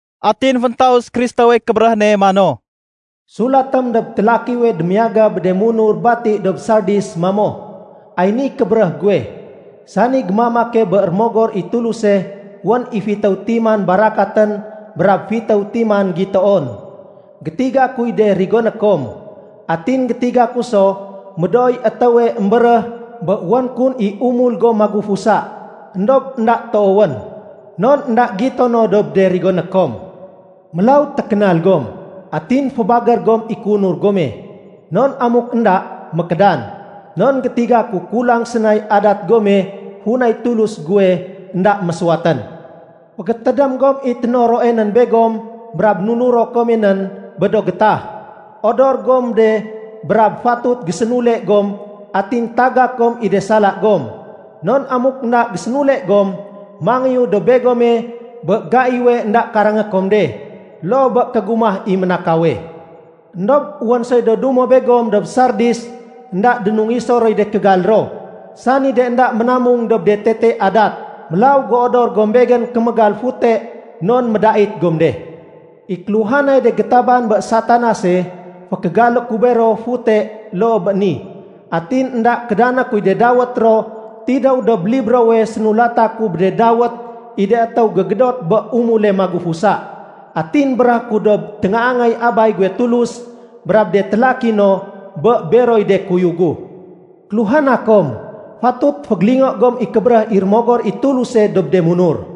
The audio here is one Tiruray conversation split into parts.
Atin féntaus Kristowey kébéréh ne mano, “Sulatém dob télakiwe démiyaga bé de munur bati dob Sardis mamo, ‘Ay niy kébéréh guwe, sani gémamake bé Rémogor i Tuluse wén i fitéw timan barakatén brab do fitéw timan gitoon. Gétiga kuy de rigoné kom. Atin gétiga ku so médooy étéwe émbéréh bé wén kun i umul gom magufusa. Endob énda toowén, non énda gitono dob de rigoné kom. Mélaw, tékénal gom! Atin fébagér gom i kéunur gome, non amuk énda, mékédan. Non gétiga ku kulang sénay adat gome funay Tulus guwe énda mésuwatén. Fégétédém gom i ténoroe nén begom brab nunuro kome nén bé do gétah. Odor gom de brab fatut gésénule gom atin tagak gom i de sala gom. Non amuk énda gésénule gom, mangéyu dob begome bé gaiwe énda karangé kom de, loo bé kégumah i ménakawe. Endob wén soy do dumo begom dob Sardis, énda dénungiso roy de kégal ro, sani de énda ménamung dob de tete adat. Mélaw géodor gom Begén kémégal fute non médait gom de. I kéluhanay de gétaban bé Satanase, fékégalé ku bero fute loo bé ni, atin énda kédané kuy de dawét ro tidéw dob librowe sénulata ku bé de dawét i de étéw gégédot bé umule magufusa. Atin béréhé ku dob téngaangay Abay guwe Tulus brab de télaki no, bé beroy de kuyug gu. “‘Kéluhana kom, fatut fégélingo gom i kébéréh i Rémogor i Tuluse dob de munur.’”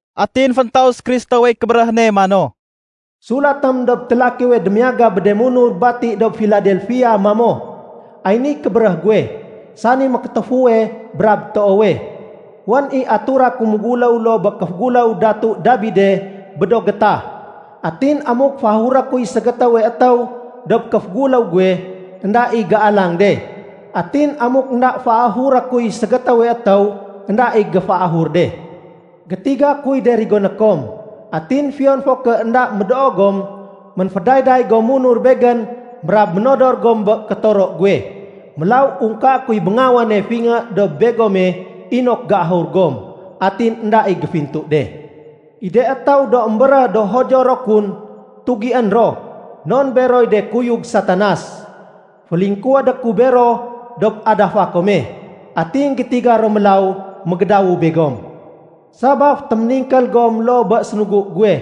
Atin féntaus Kristowey kébéréh ne mano, “Sulatém dob télakiwe démiyaga bé de munur bati dob Filadelfia mamo, ‘Ay niy kébéréh guwe, sani mékétéfuwe brab toowe. Wén i atura ku méguléw loo bé kéféguléw Datu Dabide bé do gétah. Atin amuk féahuré kuy ségétéwe étéw dob kéféguléw guwe, énda i géalang de. Atin amuk énda féahuré kuy ségétéwe étéw, énda i géféahur de. Gétiga kuy de rigoné kom. Atin fiyon fo ké énda médoo gom, ménfédayday gom munur Begén brab ménodor gom bé kétoro guwe. Mélaw ungkaé kuy béngawane fingé dob begome inok géahur gom, atin énda i géfintu de. I de étéw do émbéréh do Judio ro kun, tugién ro non beroy de kuyug Satanas. Félingkuwédé ku bero dob adafa kome, atin gétiga ro mélaw mégédawu begom. Sabaf téméningkél gom loo bé sénugu guwe,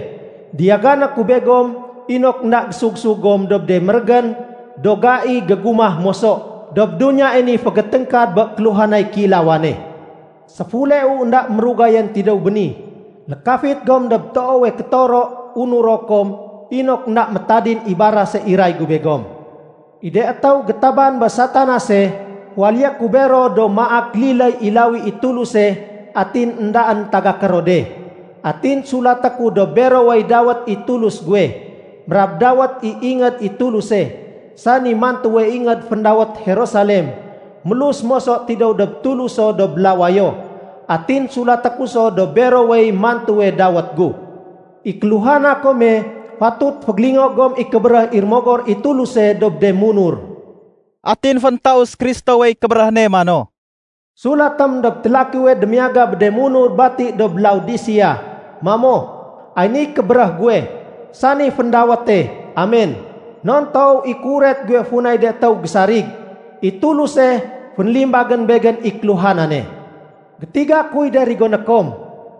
diyagané ku begom inok énda gésugsug gom dob de mérégén do gai gégumah moso dob duniyae ni fégéténgkad bé kéluhanay kéilawane. Séfuleu énda mérugayén tidéw béni. Lékafit gom dob toowe kétoro unuro kom inok énda métadin i barase iray gu begom. I de étéw gétaban bé Satanase, féwaléyé ku bero do maak liléy i lawi i Tuluse atin éndaén tagaké ro de. Atin sulaté ku dob berowey dawét i Tulus guwe, brab dawét i ingéd i Tuluse, sani mantuwe ingéd féndawét Jerusalem mélus moso tidéw dob Tuluso dob lawayo. Atin sulaté ku so dob berowey mantuwe dawét gu. “‘I kéluhana kome, fatut fégélingo gom i kébéréh i Rémogor i Tuluse dob de munur.’” Atin féntaus Kristowey kébéréh ne mano, “Sulatém dob télakiwe démiyaga bé de munur bati dob Laodisea mamo, ‘Ay niy kébéréh guwe, sani féndawéte “Amen” non toow i kéuret guwe funay de étéw gésarig. I Tuluse fénlimbagén Begén i kéluhanane. Gétiga kuy de rigoné kom.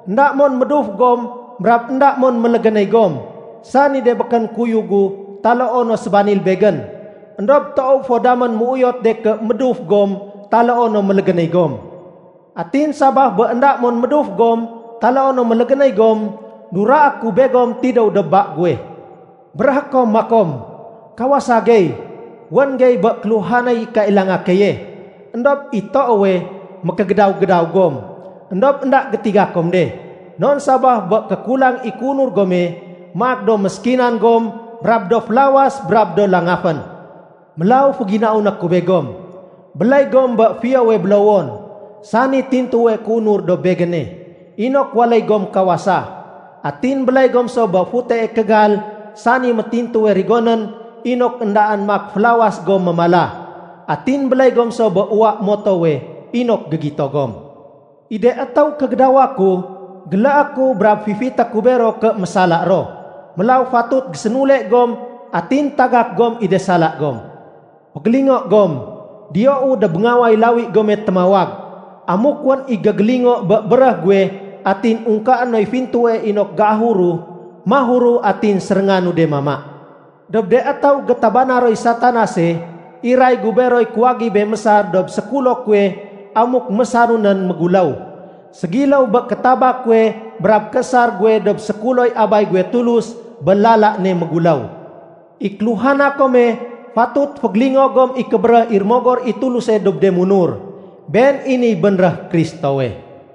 Enda mon méduf gom brab énda mon mélégénéy gom, sani de békén kuyug gu taloo no sébanil Begén. Endob toow fo damén méuyotu de ké méduf gom taloo no mélégénéy gom. Atin sabaf bé énda mon méduf gom taloo no mélégénéy gom, duraé ku begom tidéw dob ba guwe. Béréhé kom makom, “Kawasa gey, wén gey bé kéluhanay kailanga keye.” Endob i toowe, mékégédaw-gédaw gom, éndob énda gétiga kom de. Non sabaf bé kékulang i kéunur gome, maak do méskinan gom brab do félawas brab do langafén. Mélaw féginauné ku begom, béléy gom bé fiyowe bélowon, sani tintuwe kéunur dob Begéne, inok waléy gom kawasa. Atin béléy gom so bé futee kégal sani métintuwe rigonén inok éndaén maak félawas gom mémala. Atin béléy gom so bé uwa motowe inok gégito gom. I de étéw kégédawa ku, géléé ku brab fifité ku bero ké mésala ro. Mélaw fatut gésénule gom atin tagak gom i de sala gom. Fégélingo gom, diyou dob béngaway lawi gome témawag. Amuk wén i gégélingo bé béréh guwe atin ungkaé noy fintue inok géahuru, mahuru atin sérénganu de mama. Dob de étéw gétabana roy Satanase, iray gu beroy kuwagibé mésar dob sékulo kuwe amuk mésaru nén méguléw, ségiléw bé kétaba kuwe brab kéésar guwe dob sékuloy Abay guwe Tulus bé lala ne méguléw. “‘I kéluhana kome, fatut fégélingo gom i kébéréh i Rémogor i Tuluse dob de munur.’” Been i niy bénréh Kristowe.